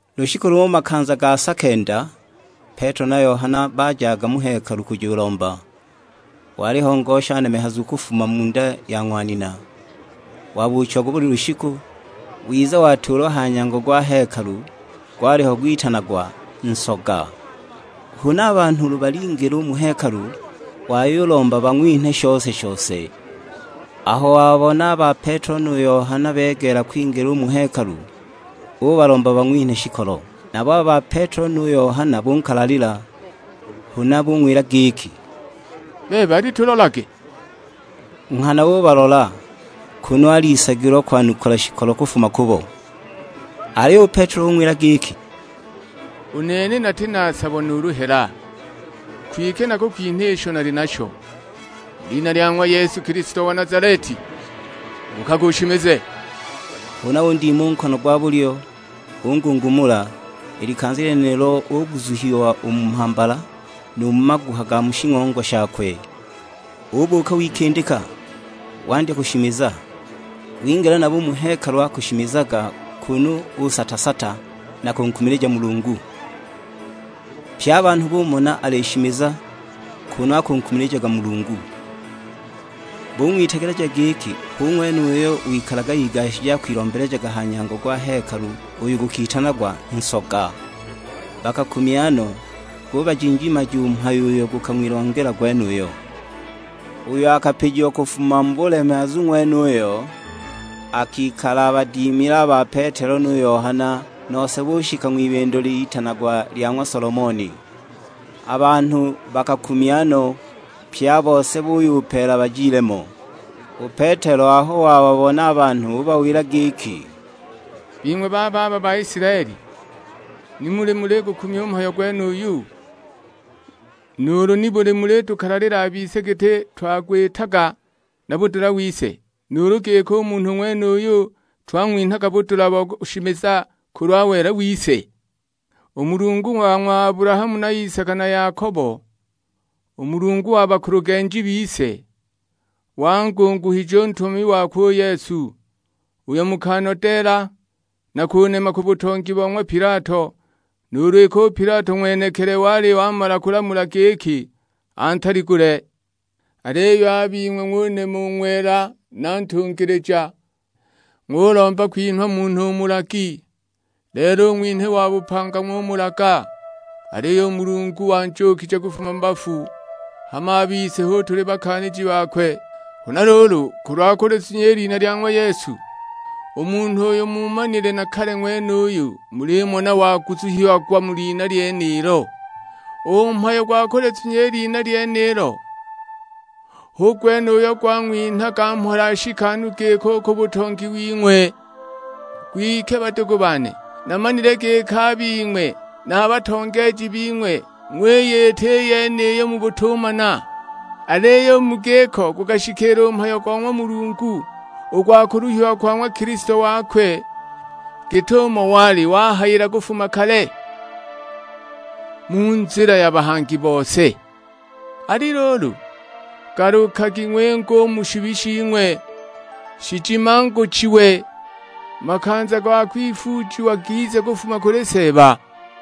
Lushiku lumo makanza ga sa kenda, Petelo na Yohana bajaga mu Hekalu kujulomba. Waliho ngosha nemehazu kufuma mu nda ya ng'wa nina, wabuuchiagwa buli lushiku, wiza watuulwa ha nyango gwa hekalu, gwaliho gwitanagwa "Nsoga." Huna a banhu ulu balingila u mu hekalu, wayulomba bang'winhe shose-shose. Aho wababona a ba Petelo nu Yohana begeela kwingila u mu hekalu, ubalomba bang'winhe shikolo. Nabo a ba Petelo nu Yohana bunkalalila; huna bung'wila giki, "Bebe alitulolage!" Nghana ubalola, kunu alisagilwa kwanukula shikolo kufuma kubo. Aliyo u Petelo ung'wila giki, "U nene nati na sabo nuulu hela, kwike nakukwinha isho nali nasho. Mu lina lya ng'wa Yesu Kilisto wa Nazaleti, buukaga ushimize." Huna undima u nkono gwa bulyo, ungungumula; i likanza lyenilo uguzuhiwa u mu mhambala, nu mu maguha ga mu shing'ongwa shakwe. Ubuuka, wikindika; wandya kushimiza. Wingila nabo u mu hekalu akushimizaga kunu usata-sata na kunkumilija Mulungu! Pye a banhu bumona alishimiza, kunu akunkumilijaga Mulungu. Bung'witegeleja giki, hu ng'wene uyo wikalaga igashije akwilombelejaga ha nyango gwa hekalu uyo gukitanagwa Nsoga. Bakakumya no, gubajinjimaja u mhayo uyo gukang'wilongela gwenuyo. Uyo akapijiwa kufuma mu bulemehazu ng'wenuyo, akikala abadimile a ba Petelo nu Yohana, nose bushika ng'wibindo litanagwa lya ng'wa Solomoni. A banhu bakakumya no, pye a bose buyupeela bajile mo. U Petelo aho wababona a banhu ubawila giki, "Bing'we bababa Baisilaeli, nibuli muligukumya u mhayo gwenuyu, nuulu nibuli mulitukalalila a bise giti twagwitaga na budula wise, nuulu giki u munhu ng'wenuyu twang'winhaga budula bo kushimiza kulwa wela wise? U Mulungu wa ng'wa Abulahamu na Isaka na Yakobo; u Mulungu wa bakulugenji bise, wangunguhije u Ntumami wakwe u Yesu, uyo mukanodeela, na kunema ku butongi bo ng'wa Pilato, nuulu iki u Pilato ng'wenekili wali wamala kulamula giki antaligule. Aliyo a bing'we ng'unema u Ng'wela na Ntungilija, ng'ulomba kwinhwa munhu mulagi. Lelo u Ng'winhi wa bupanga ng'umulaga, aliyo u Mulungu wanjuukije kufuma mu bafu, hama a bise hu tuli bakaaniji bakwe. Huna luulu, kulwa kulizunya i lina lya ng'wa Yesu, u munhu uyu muumanile na kale ng'wenuyu mulimona waguzuhiagwa mu lina lyenilo. U mhayo gwa kulizunya i lina lyenilo hu gwene uyo gwang'winhaga mhola nshikanu giki ku butongi wing'we! Kwike badugu bane, namanile giki a bing'we na a batongeeji bing'we ng'wiyita i yeniyo mu butumana. Aliyo u mu giko gukashikiila u mhayo go ng'wa Mulungu, u gwa kuluhiwa kwa ng'wa Kilisto wakwe, git'umo wali wahayila kufuma kale, mu nzila ya bahangi bose. Ali luulu, galukagi ng'winge u mu shibi shing'we, shijimanguchiwe; makanza ga kwifuujiwa gize kufuma kuli Seeba.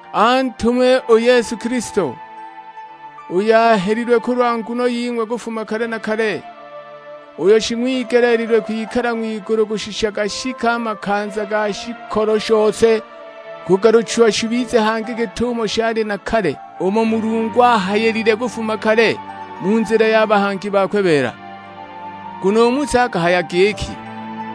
Antume u Yesu Kilisto, uyo ahelilwe kulwa nguno ying'we kufuma kale na kale, uyo shing'wigeleelilwe kwikala ng'wigulu kushisha gashike a makanza ga shikolo shose kugaluchiwa shibize hangi git'umo shaali na kale; umo Mulungu ahayilile kufuma kale, mu nzila ya bahangi bakwe beela. Nguno u Musa akahaya giki,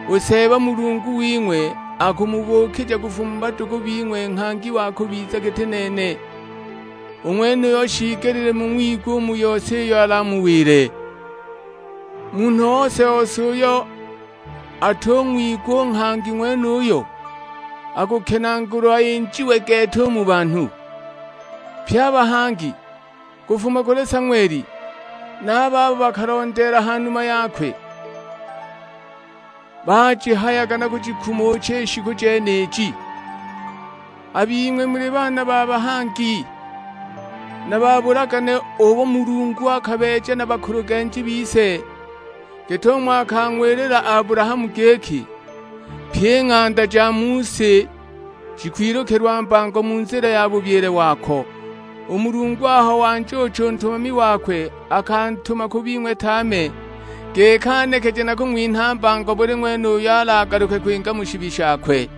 'U Seeba Mulungu wing'we akumubuukija kufuma mu badugu bing'we nghangi wa kubiza giti nene; u ng'wenuyo shiigelile mung'wigwe mu yose iyo alamuwile. Munhu ose-ose uyo atung'wigwa u nghangi ng'wenuyo, akukenaagulwa injiwe gete u mu banhu.' Pye a bahangi, kufuma kuli Sang'weli, na a babo bakalondeela ha numa yakwe, bajihayaga na kujikumucha i shiku jeniji. A bing'we muli baana ba bahangi, na ba bulagane ubo Mulungu akabeeja na bakulugenji bise; git'umo akang'wilila Abulahamu giki, 'Pyi i ng'anda ja mu si jikwilukilwa mbango mu nzila ya bubyile wako.' U Mulungu aho wanjuucha u Ntumami wakwe akantuma ku bing'we tame, giki anekeje na kung'winha mbango buli ng'wene uyo alagaluke kwinga mu shibi shakwe."